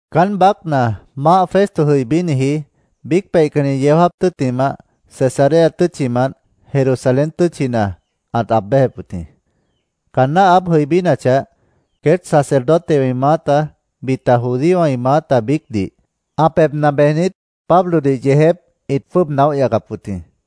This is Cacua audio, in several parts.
Caán baácna Maáh Festo jʉibíniji biíc peihcanni yeó jáap tʉ́ttimah, Cesarea tʉ́tchimant Jerusalén tʉ́tchina ãt aab béjep wʉt jĩ. Caanná ã aáb jʉibínachah, queét sacerdotewã ĩ maáta, bita judíowã ĩ maáta biícdih ã pebhna bejnit, Pablodih yeejép ĩt jwʉ́ʉb naóh yacap wʉt jĩ.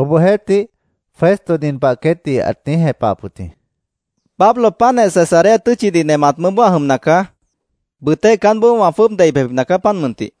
Obohjeéhtih, Festo nin pah queétdih ãt niíj jepahap wʉt jĩ: —Pablo páantjeh Cesarea tʉ́tchidih nemat mʉʉ́boó ã jʉmna caá. Bʉʉtéh caánboó wã jwʉ́ʉb dei bejbipna caá, páant mʉntih.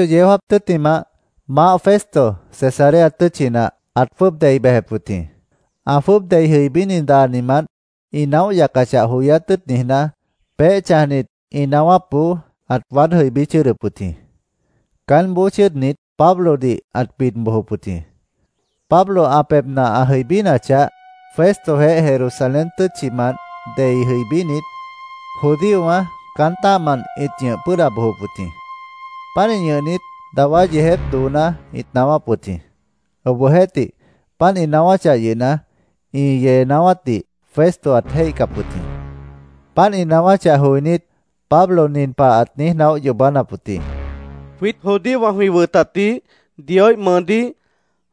Ocho yeó jáap tʉ́ttimah, Maáh Festo Cesarea tʉ́tchina ãt jwʉ́ʉb dei bejep wʉt jĩ. Ã jwʉ́ʉb dei jʉibíni daanimant, ĩ naóh yacachah joyát tʉ́ʉt niijná, peéh chãjnit ĩ naáwápboó ãt waád jʉibí chʉ́ʉdʉp wʉt jĩ. Caánboó chʉ́ʉdnit, Pablodih ãt bid bojop wʉt jĩ. Pablo ã pebhna ã jʉibínachah, Festojeéh Jerusalén tʉ́tchimant dei jʉibínit judíowã caán tã́ahmant ĩt ñʉh pʉ́ʉda bojop wʉt jĩ. Pánih ñʉhnit, dawá yeejép dooná ĩt naáwáp wʉt jĩ. Obohjeéhtih, páant ĩ naáwáchah yʉhna, ĩ yee naáwátdih Festo ãt jéihcap wʉt jĩ. Páant ĩ naáwáchah joinít, Pablo nin pah ãt niíj naóh yoobánap wʉt jĩ: —Jwiít judíowã jwĩ wʉtatdih, Dioíh mʉʉdíh,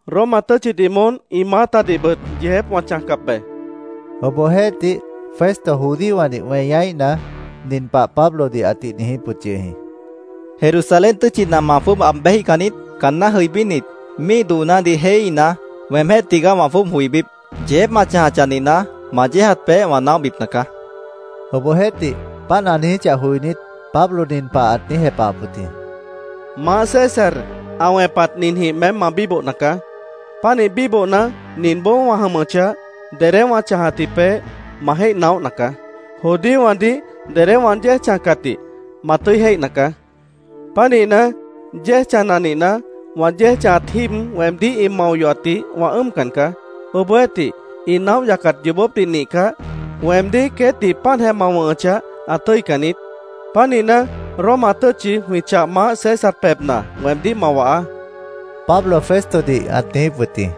Roma tʉ́tchidih moón ĩ maáhdihbʉt yeejép wã chãjcap be, ãt niijíp wʉt jĩ. Obohjeéhtih, Festo judíowãdih weñaíhna, nin pah Pablodih ãtih niijíp wʉt yʉh jĩ: —¿Jerusalén tʉ́tchina ma jwʉ́ʉb aab béjíhcan niít? Caanná jʉibínit, míih doonádih jéihíhna, weemjéh tigaá wã jwʉ́ʉb joibíp. Yeejép ma chãjachah nihna, ma yéejat peéh wã naóhbipna caá, ãt niijíp wʉt jĩ. Obohjeéhtih, páant ã niijíchah joinít, Pablo nin pah ãt niíj jepahap wʉt jĩ: —Maáh César ã wẽpat ninjĩh meém ma bíbohna caá. Pánih bíbohna, ninboó wã jʉmʉchah, dedé wã chãjatji peéh, ma jéih naóhna caá. Judíowãdih dedé wã yéej chãjcatdih ma tʉ́i jéihna caá. Pánihna, yéej chãjna nihna, wã yéej chãjat jíib weemdíh ĩ mao yohatdih wã ʉ́ʉmcan caá. Obohjeéhtih, ĩ naóh yacat yoobópdih nihcah, weemdíh queétdih páantjeh ma wʉ̃hʉchah, ã tʉ́ican niít. Pánihna, Roma tʉ́tchi jwĩ chah maáh César pebhna weemdíh ma wahaá, Pablo Festodih ãt niijíp wʉt jĩ.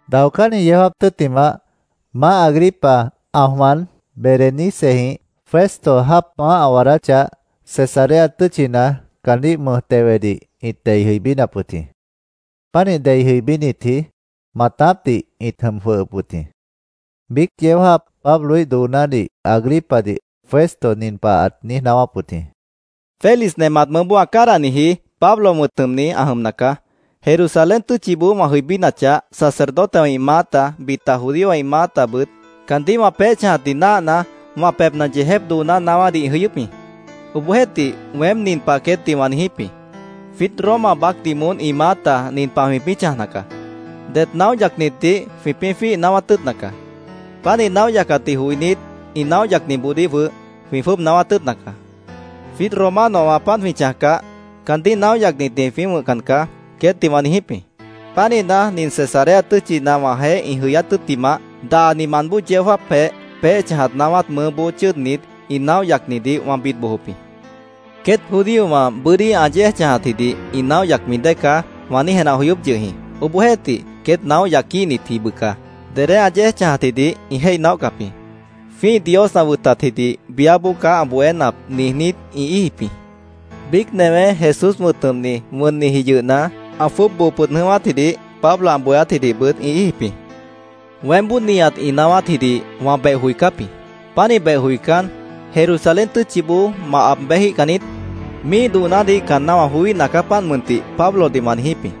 Daocánni yeó jáap tʉ́ttimah, maáh Agripa ã jwan Berenicejĩh Festo jáap maáh ã waadáchah, Cesarea tʉ́tchina caandíh mʉj tewedih ĩt dei jʉibínap wʉt jĩ. Pánih dei jʉibínitji maatápdih ĩt jʉm jwʉhʉp wʉt jĩ. Biíc yeó jáap Pabloíh doonádih Agripadih Festo nin pah ãt niíj naáwáp wʉt jĩ: —Félix nemat mʉʉ́boó ã cádahniji, Pablo wʉ̃t jʉmni, ã jʉmna caá. Jerusalén tʉ́tchiboó wã jʉibínachah, sacerdotewã ĩ maáta, bita judíowã ĩ maátabʉt caandíh wã peéh chãjatdih náahna, wã pebhna yeejép dooná naáwádih ĩ jʉyʉ́p jĩ. Obohjeéhtih weém nin pah queétdih wã niijíp jĩ: ‘Jwiít Roma baácdih moón ĩ maáta nin pah jwĩpĩ́ chãjna caá: Det naóh yacnitdih jwĩpĩ́ jwíih naáwát tʉ́ʉtna caá. Páant ĩ naóh yacatdih joinít, ĩ naóh yacniboodíh jwʉh jwĩ jwʉ́ʉb naáwát tʉ́ʉtna caá. Jwiít Romanowã páant jwĩ chãjcah, caandíh naóh yacnitdih jwĩpĩ́ wʉ̃hcan caá’, queétdih wã niijíp jĩ. Pánihna, nin Cesarea tʉ́tchina wãjeéh ĩ jʉyát tʉ́ttimah daanimant bóo yeó jáapjeh peéh chãjat naáwát mʉʉ́boó chʉ́ʉdnit, ĩ naóh yacnidih wã bid bojop jĩ. ‘Queét judíowã bʉ́dí ã yéej chãjatjidih ĩ naóh yacmi dée caá’, wã niíj jenah joyóp yʉh jĩ. Obohjeéhtih queét naóh yaquíhnitji bʉca dedé ã yéej chãjatjidih ĩ jéih naóhcap jĩ. ‘Jwĩ́ih Dios ã wʉtatjidih biáboó caá ã bohénap’, niijnít, ĩ íijip jĩ. Biíc newé, Jesús wʉ̃t jʉmni, wʉnniji yʉhna, ã jwʉ́ʉb boo pʉd jʉ̃ʉ́wátjidih Pablo ã bohéátjidihbʉt ĩ íijip jĩ. Weémboó nihat ĩ naáwátjidih wã beh joicáp jĩ. Pánih beh joicán, ‘¿Jerusalén tʉ́tchiboó ma aab béjíhcan niít? Míih doonádih caanná wã joííhna caá, páant mʉntih’, Pablodih wã niijíp jĩ.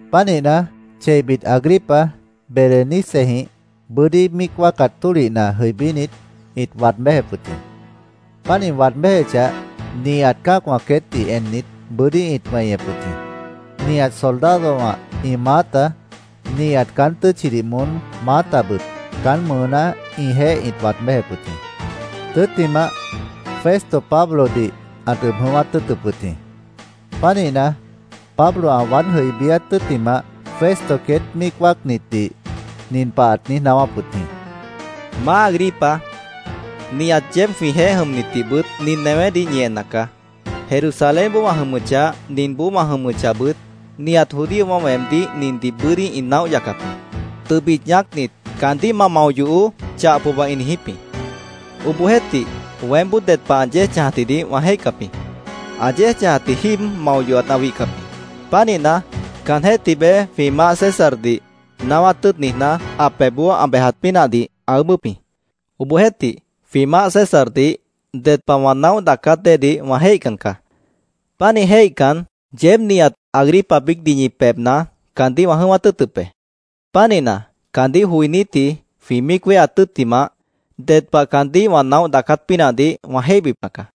Pánihna, cheibit Agripa Berenicejĩh bʉ́dí míic wáacat tólihna jʉibínit, ĩt waad béjep wʉt jĩ. Páant ĩ waad béjechah, nihat cã́acwã queétdih ennit, bʉ́dí ĩt weñep wʉt jĩ. Nihat soldadowã ĩ maáta, nihat caán tʉ́tchidih moón maátabʉt caán mʉʉná ĩjeéh ĩt waad béjep wʉt jĩ. Tʉ́ttimah, Festo Pablodih ãt ʉb jʉ̃ʉ́wát tʉ́ʉtʉp wʉt jĩ. Pánihna, Pablo ã waád jʉibíát tʉ́ttimah, Festo queét míic wáacnitdih nin pah ãt niíj naáwáp wʉt jĩ: —Maá Agripa, nihat yeéb jwĩjeéh jʉmnitbʉt nin newédih ñi enna caá. Jerusalénboó wã jʉmʉchah, ninboó wã jʉmʉchahbʉt, nihat judíowã weemdíh nindih bʉ́dí ĩ naóh yacap jĩ. Tʉbit ñaácnit, ‘Caandíh ma mao yohoó’, chah pohba ĩ niijíp jĩ. Obohjeéhtih, weémboó ded pah ã yéej chãjatjidih wã jéihcap jĩ. Ã yéej chãjatji jíib mao yohat ã wihcap jĩ. Pánihna, caanjéh tibeé jwĩ maáh Césardih naáwát tʉ́ʉt niijná, ã pebhboó ã bejat pínahdih ã ʉʉ́bʉ́p jĩ. Obohjeéhtih, jwĩ maáh Césardih ded pah wã naóh daacát déedih wã jéihcan caá. Pánih jéihcan, yeéb nihat, Agripa biícdih ñi pebhna caandíh wã jʉ̃ʉ́wát tʉ́ʉtʉp be. Pánihna, caandíh joinítji jwĩ míic wéheat tʉ́ttimah, ded pah caandíh wã naóh daacát pínahdih wã jéihbipna caá.